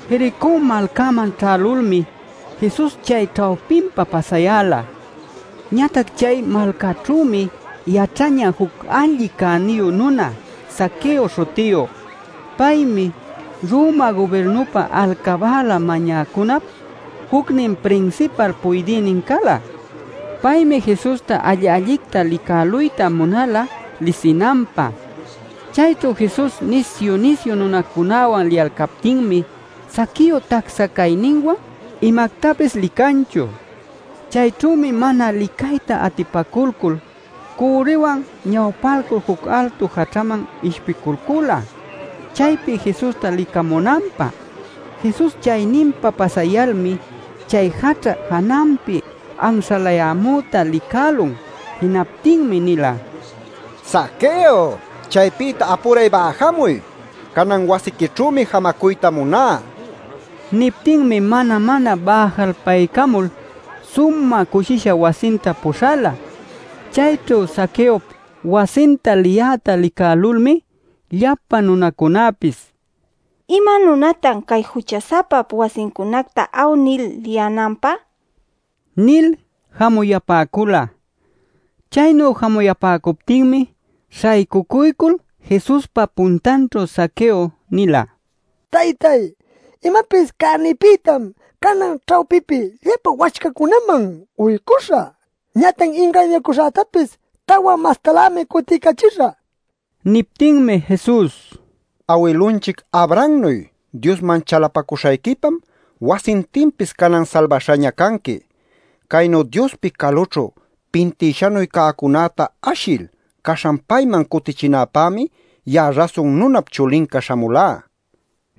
Jericó malcäman ćhälulmi Jesus chay ćhawpinpa pasayäla. Ñatac chay malcaćhümi yaćhañä juc alli cäniyu nuna Zaqueo śhutiyu. Paymi Roma gubirnupä alcabäla mañäcunap jucnin prinsipal puydïnin cala. Paymi Jesusta alli-allicta licäluyta munala lisinanpä. Chayćhu Jesus nisyu-nisyu nunacunäwan liyalcaptinmi Zaqueo tacsa cayninwan imactapis licanchu. Chayćhümi mana licayta atipaculcul cürriwan ñawpalcul juc altu jaćhaman ishpiculcula chaypi Jesusta licamunanpä. Jesus chayninpa pasayalmi chay jaćha jananpi anśhalayämüta licälun. Jinaptinmi nila: “Zaqueo, ¡chaypïta apuray bäjamuy! Canan wasiquićhümi jamacuyta muná” nil. Niptinmi mana-mana bäjalpaycamul sumä cushisha wasinta puśhala. Chayćhu Zaqueop wasinta liyäta licälulmi, llapa nunacunapis “¡Ima nunatan cay jucha-sapap wasincunacta awnil liyänanpä!” nil jamuyapäcula. Chaynu jamuyapäcuptinmi śhaycucuycul Jesuspa puntanćhu Zaqueo nila: “Taytay, imapis cänïpïtam canan ćhawpipi llapa wacchacunäman uycuśhä. Ñatac ingañacuśhätapis tawa mastalämi cutiycachishä” nil. Niptinmi Jesus: “Awilunchic Abrahamnuy Diosman chalapacuśhayquipam wasintinpis canan salbaśhaña canqui. Caynu Diospi calućhu pintïshanuy cäcunäta ashil caśhan payman cutichinäpämi ya'a Rasun Nunap Chulinca śhamulá” nila.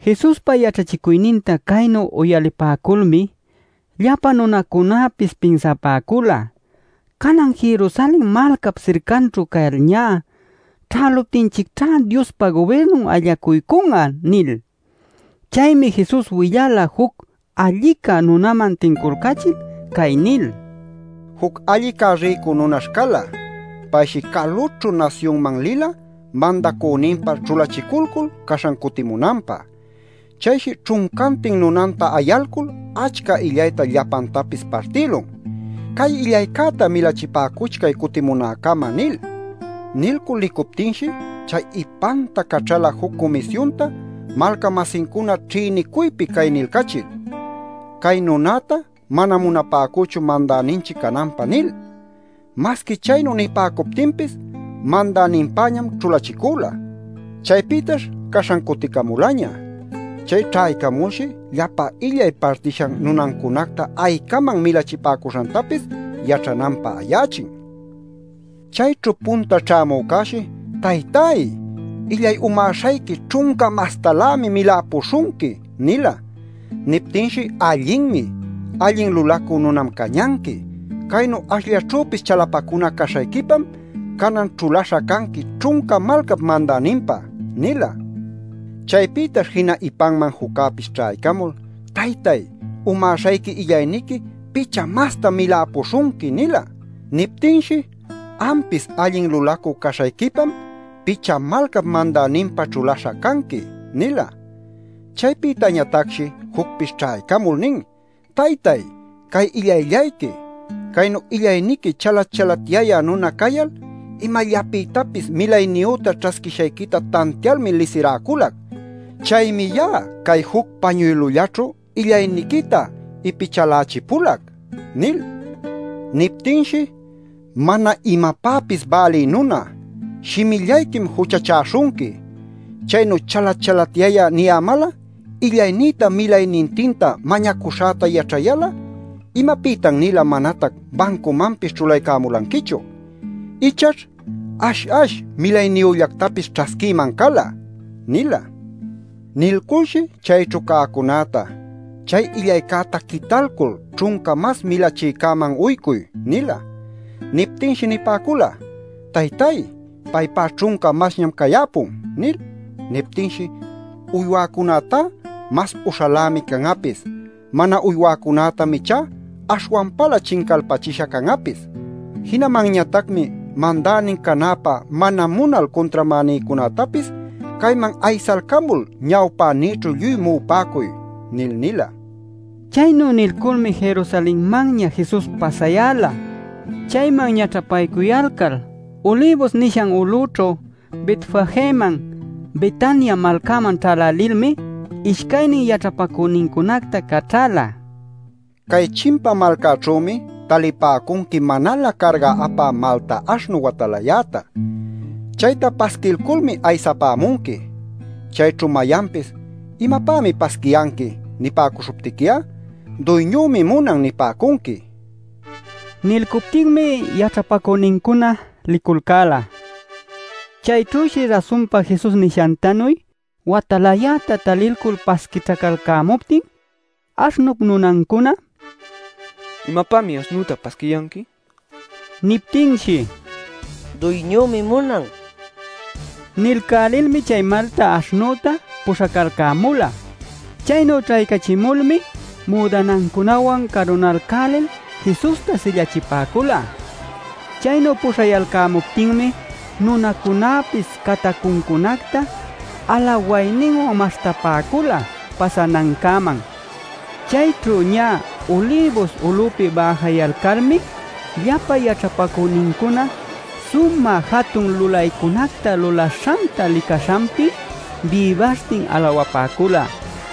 Jesuspa yaćhachicuyninta caynu uyalipäculmi llapa nunacunapis pinsapäcula: “Canan Jerusalen malcap sircanćhu cayalñá ćhäluptinchicćhá Diospa gubirnun allacuycun'a” nil. Chaymi Jesus willala juc allica nunaman tinculcachil cay nil: “Juc allica rïcu nunash cala. Payshi calućhu nasyunman lila mandacüninpä ćhulachiculcul, caśhan cutimunanpä. Chayshi ćhuncantin nunanta ayalcul achca illayta llapantapis partïlun: ‘Cay illaycäta milachipäcuchcay cutimunäcama’ nil. Nilcul licuptinshi chay ipanta caćhala juc cumisyunta malca-masincuna ćhïnicuypi cay nilcachil: ‘Cay nunäta manam munapäcüchu mandäninchic cananpä’ nil. “Masqui chaynu nipäcuptinpis mandäninpäñam ćhulachicüla. Chaypïtash caśhan cuticamulaña. Chay ćhaycamulshi llapa illay partishan nunancunacta aycaman milachipäcuśhantapis yaćhananpä ayachin. “Chayćhu punta ćhämücäshi: ‘Taytáy, illay umäśhayquica ćhunca mastalämi miläpuśhunqui’ nila. “Niptinshi: ‘Allinmi. Allin lulacü nunam cañanqui. Caynu ashllaćhüpis chalapacuna caśhayquipam canan ćhulaśha canqui ćhunca malcap mandäninpä’ nila. “Chaypïtash jina ipanman juccäpis ćhaycamul: ‘Taytáy, umäśhayqui illayniqui picha mastam miläpuśhunqui’ nila. “Niptinshi: ‘Ampis allin lulacü caśhayquipam picha malcap mandäninpä ćhulaśha canqui’ nila. “Chaypïtañatacshi jucpis ćhaycamul nin: ‘Taytáy, cay illayllayqui. Caynu illayniqui chalat-chalatyayä nuna cayal imallapïtapis milayniyüta ćhasquishayquita tantialmi lisiräculac. Chaymi ya'a cay juc pañuylullaćhu illayniquita ipichalächipulac’ nil. “Niptinshi: ‘¡Mana imapäpis bälï nuna! Shimillayquim juchachäśhunqui. Chaynu chalat-chalatyayä niyämal'a, illaynïta milaynintinta mañacuśhäta yaćhayal'a ¿imapïtan-nila manatac bancumanpis ćhulaycämulanquichu? Ichaćh ash-ash milayniyüllactapis ćhasquïman cala’ nila. Nilculshi chayćhu cäcunäta: ‘Chay illaycäta quitalcul ćhunca mas milachïcäman uycuy’ nila. “Niptinshi nipäcula: ‘Taytáy, paypá ćhunca masñam cayäpun’ nil. “Niptinshi: ‘Uywäcunätá mas uśhalämi can'apis. Mana uywäcunätam ichá aśhwanpalä chincalpachisha can'apis. Jinamanñatacmi mandänin canäpä mana munal cuntramänïcunätapis cayman aysalcamul ñawpänïćhu lluy mu'upäcuy’ nil” nila. Chaynu nilculmi Jerusalenmanña Jesus pasayäla. Chayman ñaćhapaycuyalcal, Ulibus nishan ulućhu Betfageman Betania malcaman ćhälälilmi ishcaynin yaćhapacüninta caćhäla: “Cay chimpa malcaćhümi talipäcunqui manalä carga apä malta aśhnu watalayäta. Chayta pasquilculmi aysapämunqui. Chayćhu mayanpis ‘¿Imapämi pasquiyanqui?’ nipäcuśhuptiqui'a ‘Duyñümi munan’ nipäcunqui” nil. Nilcuptinmi yaćhapacünincuna liculcäla. Chayćhüshi rasunpa Jesus nishantanuy watalayäta talilcul pasquićhacalcämuptin aśhnup nunancuna: “¿Imapämi aśhnüta pasquiyanqui?” nil nipäcun. Niptinshi: “Duyñümi munan” nipäcula. Nilcälilmi chay malta aśhnüta puśhacalcämula. Chaynu ćhaycachimulmi müdanancunawan carunalcälil Jesusta sillachipäcula. Chaynu puśhayalcämuptinmi nunacunäpis catacuncunacta alawayninwan maśhtapäcula pasanancäman. Chayćhu ñä Ulibus ulupi bäjayalcalmi llapa yaćhapacünincuna sumä jatun lulaycunacta lulaśhanta licaśhanpi bïbaśhtin alawapäcula: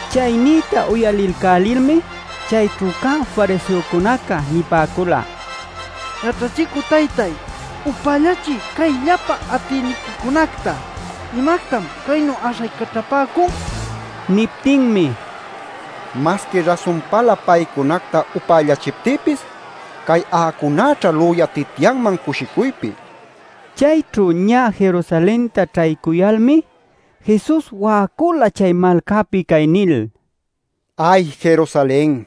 Chay niyta uyalilcälilmi chayćhu cä Fariseocunaca nipäcula: “Yaćhachicü taytay, ¡upällachiy cay llapa atïniquicunacta! ¿Imactam caynu äśhaycaćhapäcun?” nil. Niptinmi: “Masqui rasunpalä paycunacta upällachiptïpis cay a'acunäćha lüyatityanman cushicuypi” nila. Chayćhu ñä Jerusalenta ćhaycuyalmi Jesus wa'acula chay malcäpi cay nil: “¡Ay Jerusalen!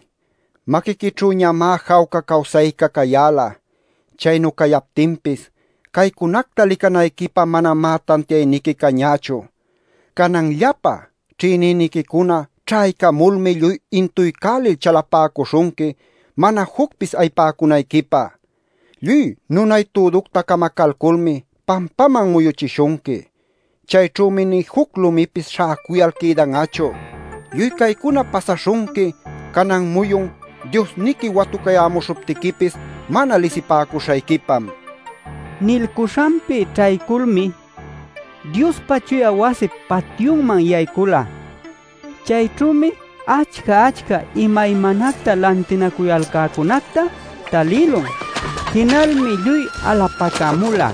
Maquiquićhünüñamá jawca cawsayca cayäla. Chaynu cayaptinpis caycunacta licanayquipä manamá tantiayniqui cañächu. Canan llapa ćhïnïniquicuna ćhaycamulmi lluy intuycälil chalapäcuśhunqui, mana jucpis ayipäcunayquipä. Lluy nunay-tuducta camacalculmi pampaman muyuchishunqui. Chayćhümi nï juc lumipis śhäcuyal quïdan'achu. Lluy caycuna pasaśhunqui canan muyun Diosniqui watucayämuśhuptiquipis mana lisipäcuśhayquipam” nila. Nilcuśhanpi ćhayculmi Diospa chuya wasip patyunman yaycula. Chayćhümi achca-achca imaymanacta lantinacuyalcäcunacta talïlun. Jinalmi lluy alapacämula: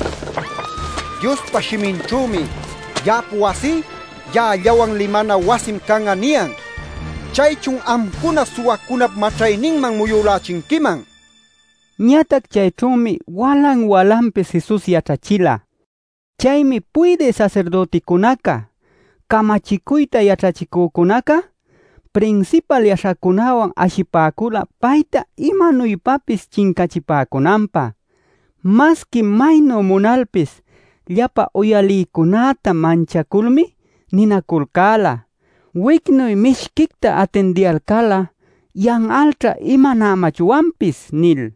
“Diospa shiminćhümi: ‘Ya'ap wasí ya'allawan limanan wasim can'a’ niyan. ¡Chaychun amcuna suwacunap maćhayninman muyülächinquiman!” nishtin. Ñatac chayćhümi walan-walanpis Jesus yaćhachila. Chaymi puydï sasirdüticunaca, camachicuyta yaćhachicücunaca, prinsipal yaśhacunäwan ashipäcula payta imanuypapis chincachipäcunanpä. Masqui maynu munalpis llapa uyalïcunäta manchaculmi ninaculcäla: “Wicnuy mishquicta atindiyalcal'a yan'alćha imanämachwanpis” nil.